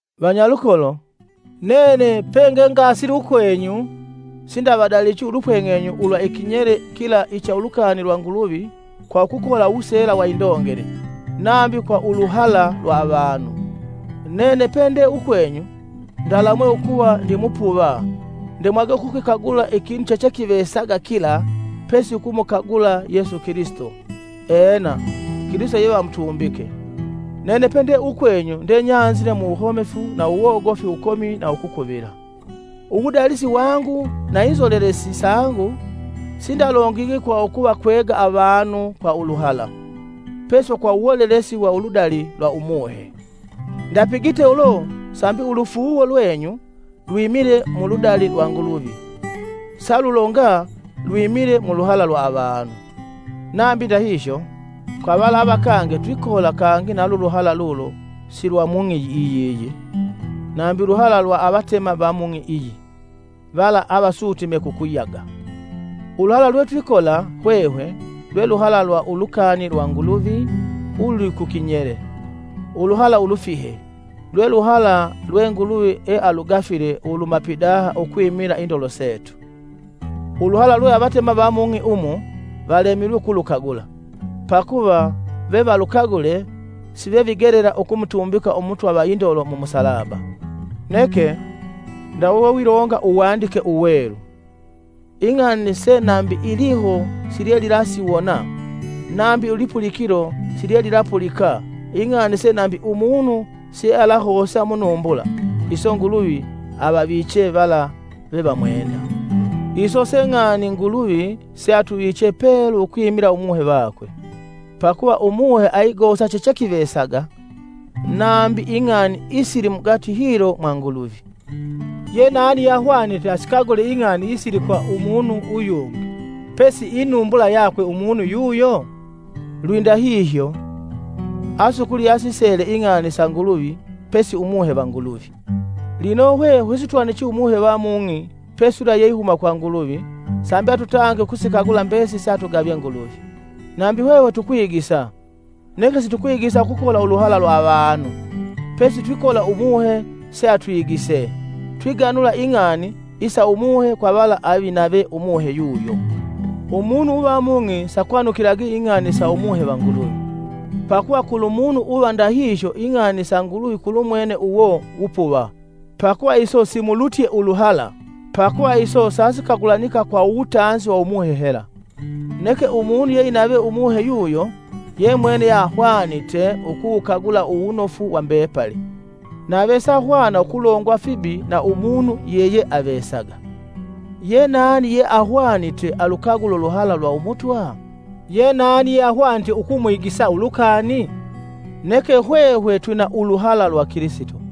Vanyalukolo, nene pengengasile ukwenyu sindavadalichi ulupweng'enyu ulwa ikinyele kila icha ulukani lwa Nguluvi kwa ukukola uwuseela wa indongele, nambi kwa uluhala lwa avanu. Nene pende ukwenyu ndalamwe ukuva ndimupuva ndemwage ukukikagula ikinu chechekivesaga kila pesi ukumukagula Yesu Kilisito, ena, Kilisito yevamutumbike. Nene pende ukwenyu ndenyanzile muwuhomefu na uwogofi wukomi na ukukuvila. Uwudalisi wangu na inzolelesi sangu sindalongigi kwa ukuvakwega avanu kwa uluhala, pesi kwa uwolelesi wa uludali lwa Umuhe. Ndapigite ulo sambi ulufuuwo lwenyu lwimile muludali lwa Nguluvi, salulonga lwimile muluhala lwa avanu. Nambi ndahihyo, kwa vala avakange twikola kangi na luluhala lulo si lwa mung'i yiyi, nambi uluhala lwa avatema va mung'i iyi, vala avasutine kukuyaga. Uluhala lwetwikola hwehwe, lwe luhala lwa ulukani lwa Nguluvi ululi ku kinyele, uluhala ulufihe, lwe luhala lwe Nguluvi ealugafile uluhuma pidaha ukwimila indolo setu. Uluhala lwe avatema va mung'i umu, valemilwe ukulukagula, pakuva vevalukagule, sivevigelela ukumutumbika Umutwa va indolo mu musalaba, Neke, ndawe wewilonga Uwandike Uwelu, “Ing'ani se nambi iliho silyelilasiwona, nambi ilipulikilo silyelilapulika, ing'ani se nambi umunu siealahosa munumbula. Iso Nguluvi avaviche vala vevamwenda.” Iso se ng'ani Nguluvi, seatuviche pelu ukwimila Umuhe vakwe. Pakuva Umuhe aigosa chechekivesaga, nambi ing'ani isili mugati hilo mwa Nguluvi. Yenani yeahwanite asikagule ing'ani isili kwa umunu uyungi pesi inumbula yakwe umunu uyo? Lwindahihyo, asukuli yeasisele ing'ani sa Nguluvi pesi Umuhe va Nguluvi. Lino hwehwe sitwanuchi Umuhe va mung'i pesi yula yeihuma kwa Nguluvi sambi atutange ukusikagula mbesili seatugavye Nguluvi. Nambi hwehwe tukwigisa, neke situkwigisa ukukola uluhala lwa avanu, pesi twikola Umuhe se atwigise, twiganula ing'ani isa Umuhe kwa vala avinave Umuhe yuyo. Umunu uva mung'i sakwanukilagi ing'ani sa Umuhe va Nguluvi. Pakuva kulumunu uva ndahihyo ing'ani sa Nguluvi kulumwene uwo wupuva, pakuva iso simulutye uluhala pakuva iso sasikagulanika kwa uwutanzi wa Umuhe hela. Neke umunu yeinave Umuhe yuyo, yemwene yeahwanite ukuwukagula uwunofu wa mbepali, nave sahwana ukulongwa fibi na umunu yeyeavesaga. “Yenani yeahwanite alukagule uluhala lwa Umutwa? Yenani yeahwanite ukwigisa ulukani?” Neke hwehwe twina uluhala lwa Kilisito.